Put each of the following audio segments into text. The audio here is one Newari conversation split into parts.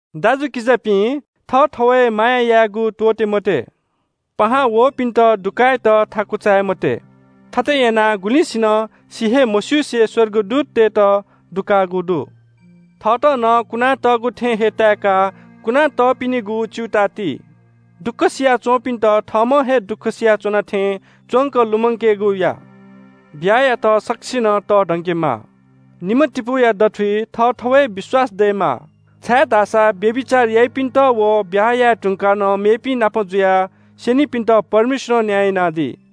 दाजुकिजापिं, थःथवय् माया यायेगु त्‍वःते मते। पाहां वःपिन्‍त दुकाय्‌त थाकुचाय् मते। थथे यानाः गुलिसिनं सि हे मस्‍युसे स्‍वर्गदूततय्‌त दुकाःगु दु। थःत नं कुना तःगु थें हे ताय्‌काः कुना तःपिनिगु च्‍यूताः ति। दुःख सियाच्‍वंपिन्‍त थःम्‍हं हे दुःख सियाच्‍वना थें च्‍वंक लुमंकेगु या। ब्‍याहायात सकसिनं तःधंकेमाः। निम्‍हतिपूया दथुइ थःथवय् विश्‍वास दयेमाः, छाय्‌धाःसा व्‍यभिचार याइपिन्‍त व ब्‍याहा याये धुंकाः नं मेपिं नाप जुयाः स्‍यनिपिन्‍त परमेश्‍वरं न्‍याय यानादी। छिमिगु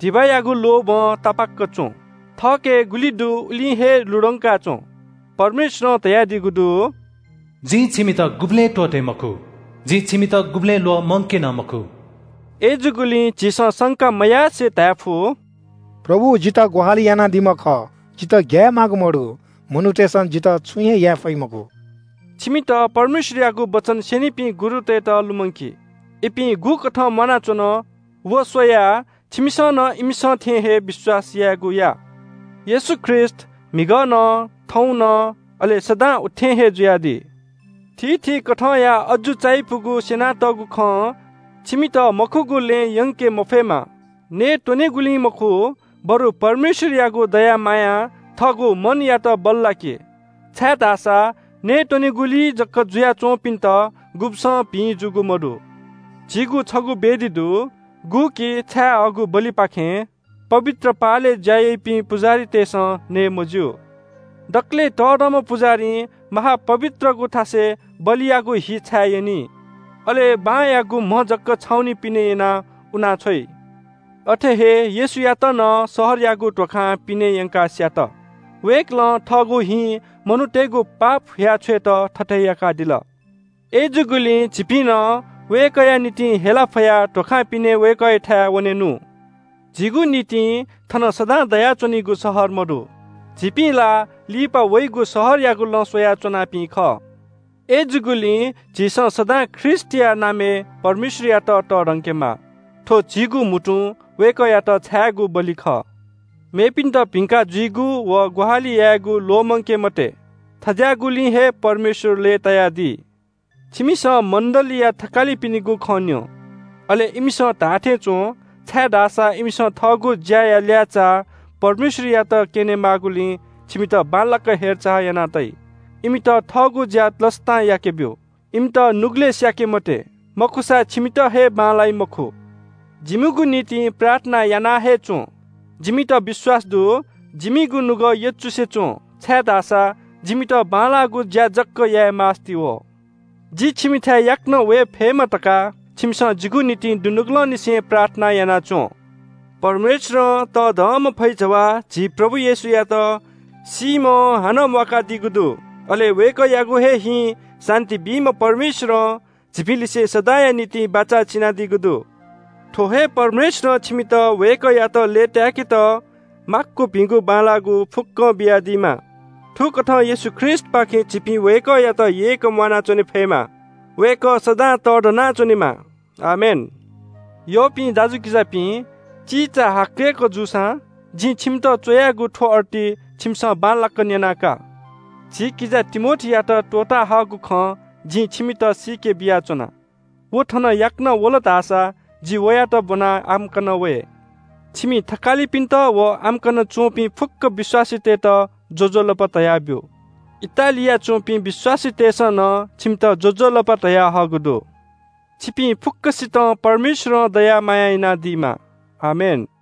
जीवनय् धिबायागु लोभं तापाक च्‍वँ। थःके गुलि दु उलिं हे लुधंका च्‍वँ। परमेश्‍वरं धयादीगु दु – “जिं छिमित गुबलें त्‍वःते मखु, जिं छिमित गुबलें त्‍यागय् याये नं मखु।” अय्‌जूगुलिं झीसं संका मयासें धायेफु – “प्रभु जितः ग्‍वाहालि यानादीम्‍ह खः। जितः ग्‍याये माःगु मदु। मनूतय्‌सं जितः छुं हे याये फइ मखु।” छिमित परमेश्‍वरयागु वचन स्‍यनीपिं गुरुतय्‌त लुमंकी। इपिं गुकथं म्‍वानाच्‍वन, व स्‍वयाः छिमिसं नं इमिसं थें हे विश्‍वास यायेगु या। येशू ख्रीष्‍ट म्‍हिगः नं थौं नं अले सदां उथें हे जुयादी। थीथी कथंया अजू चायापुगु स्‍यनातःगु खं छिमित मखुगु लँय् यंके मफयेमा। नयेत्‍वनेगुलिं मखु, बरु परमेश्‍वरयागु दया मायां थःगु मनयात बल्‍लाकि, छाय्‌धाःसा नयेत्‍वनेगुलिइ जक जुयाच्‍वंपिन्‍त गुब्‍सं भिं जूगु मदु। झीगु छगू वेदी दु, गुकी छायेहःगु बलिपाखें पवित्र पालय् ज्‍या याइपिं पुजाहारीतय्‌सं नये मज्‍यू। दकलय् तःधंम्‍ह पुजाहारीं महा-पवित्रगु थासय् बलियागु हि छाये यनी। अले बांयागु म्‍ह जक छाउनीं पिने यनाः उनाछ्वइ। अथे हे येशूयात नं शहरयागु ध्‍वाखां पिने यंकाः स्‍यात। वय्‌कलं थःगु हिं मनूतय्‌गु पाप हुया छ्वयेत थथे याकादिल। अय्‌जूगुलिं झीपिं नं वय्‌कःया निंतिं हेला फयाः ध्‍वाखां पिने वय्‌कःयाथाय् वनेनु। झीगु निंतिं थन सदां दयाच्‍वनीगु शहर मदु। झीपिं ला लिपा वइगु शहरयागु लँ स्‍वया च्‍वनापिं खः। अय्‌जूगुलिं झीसं सदां ख्रीष्‍टया नामय् परमेश्‍वरयात तःधंकेमाः। थ्‍व झीगु म्‍हुतुं वय्‌कःयात छाइगु बलि खः। मेपिन्‍त भिंका जुइगु व ग्‍वाहालि यायेगु ल्‍वःमंके मते। थज्‍याःगु बलिं हे परमेश्‍वर लय्‌तायादी। छिमिसं मण्‍डलीया थकालिपिनिगु खँ न्‍यँ, अले इमिसं धाःथें च्‍वँ, छाय्‌धाःसा इमिसं थःगु ज्‍याया ल्‍याःचाः परमेश्‍वरयात क्‍यनेमाःगुलिं छिमित बांलाक हेरचाह याना तइ। इमित थःगु ज्‍या लसतां याकेब्‍यु, इमित नुगलय् स्‍याके मते। मखुसा छिमित हे बांलाइ मखु। जिमिगु निंतिं प्रार्थना याना हे च्‍वँ। जिमित विश्‍वास दु, जिमिगु नुगः यचुसे च्‍वँ, छाय्‌धाःसा जिमित बांलाःगु ज्‍या जक याये मास्‍ति वः। जि छिमिथाय् याकनं वये फयेमा धकाः छिमिसं जिगु निंतिं दुनुगलंनिसें प्रार्थना याना च्‍वँ। परमेश्‍वरं तःधंम्‍ह फैजवाः झी प्रभु येशूयात सीम्‍हं हानं म्‍वाकादीगु दु। अले वय्‌कःयागु हे हिं शान्‍ति बीम्‍ह परमेश्‍वरं झीपिंलिसे सदांया निंतिं बाचा चिनादीगु दु। थ्‍व हे परमेश्‍वरं छिमित वय्‌कःयात लय्‌ताय्‌केत माक्‍व भिंगु बांलाःगु फुक्‍कं बियादीमा। थुकथं येशू ख्रीष्‍टपाखें झीपिं वय्‌कःयात यय्‌क म्‍वानाच्‍वने फयेमा। वय्‌कः सदां तःधना च्‍वनेमा। आमेन। यःपिं दाजुकिजापिं, चिचाहाकय्‌क जूसां जिं छिमित च्‍वयागु थ्‍व अर्ती छिमिसं बांलाक न्‍यना का। झी किजा तिमोथीयात त्‍वःता हःगु खँ जिं छिमित सीके बियाच्‍वना। व थन याकनं वल धाःसा जि वयात ब्‍वनाः आम्‍कन वये। छिमि थकालिपिन्‍त व आम्‍कन च्‍वंपिं फुक्‍क विश्‍वासीतय्‌त ज्‍वजलपा धयाब्‍यु। इटालियाय् च्‍वंपिं विश्‍वासीतय्‌सं नं छिमित ज्‍वजलपा धयाहःगु दु। छिपिं फुक्‍कसितं परमेश्‍वरं दया माया यानादीमा। आमेन।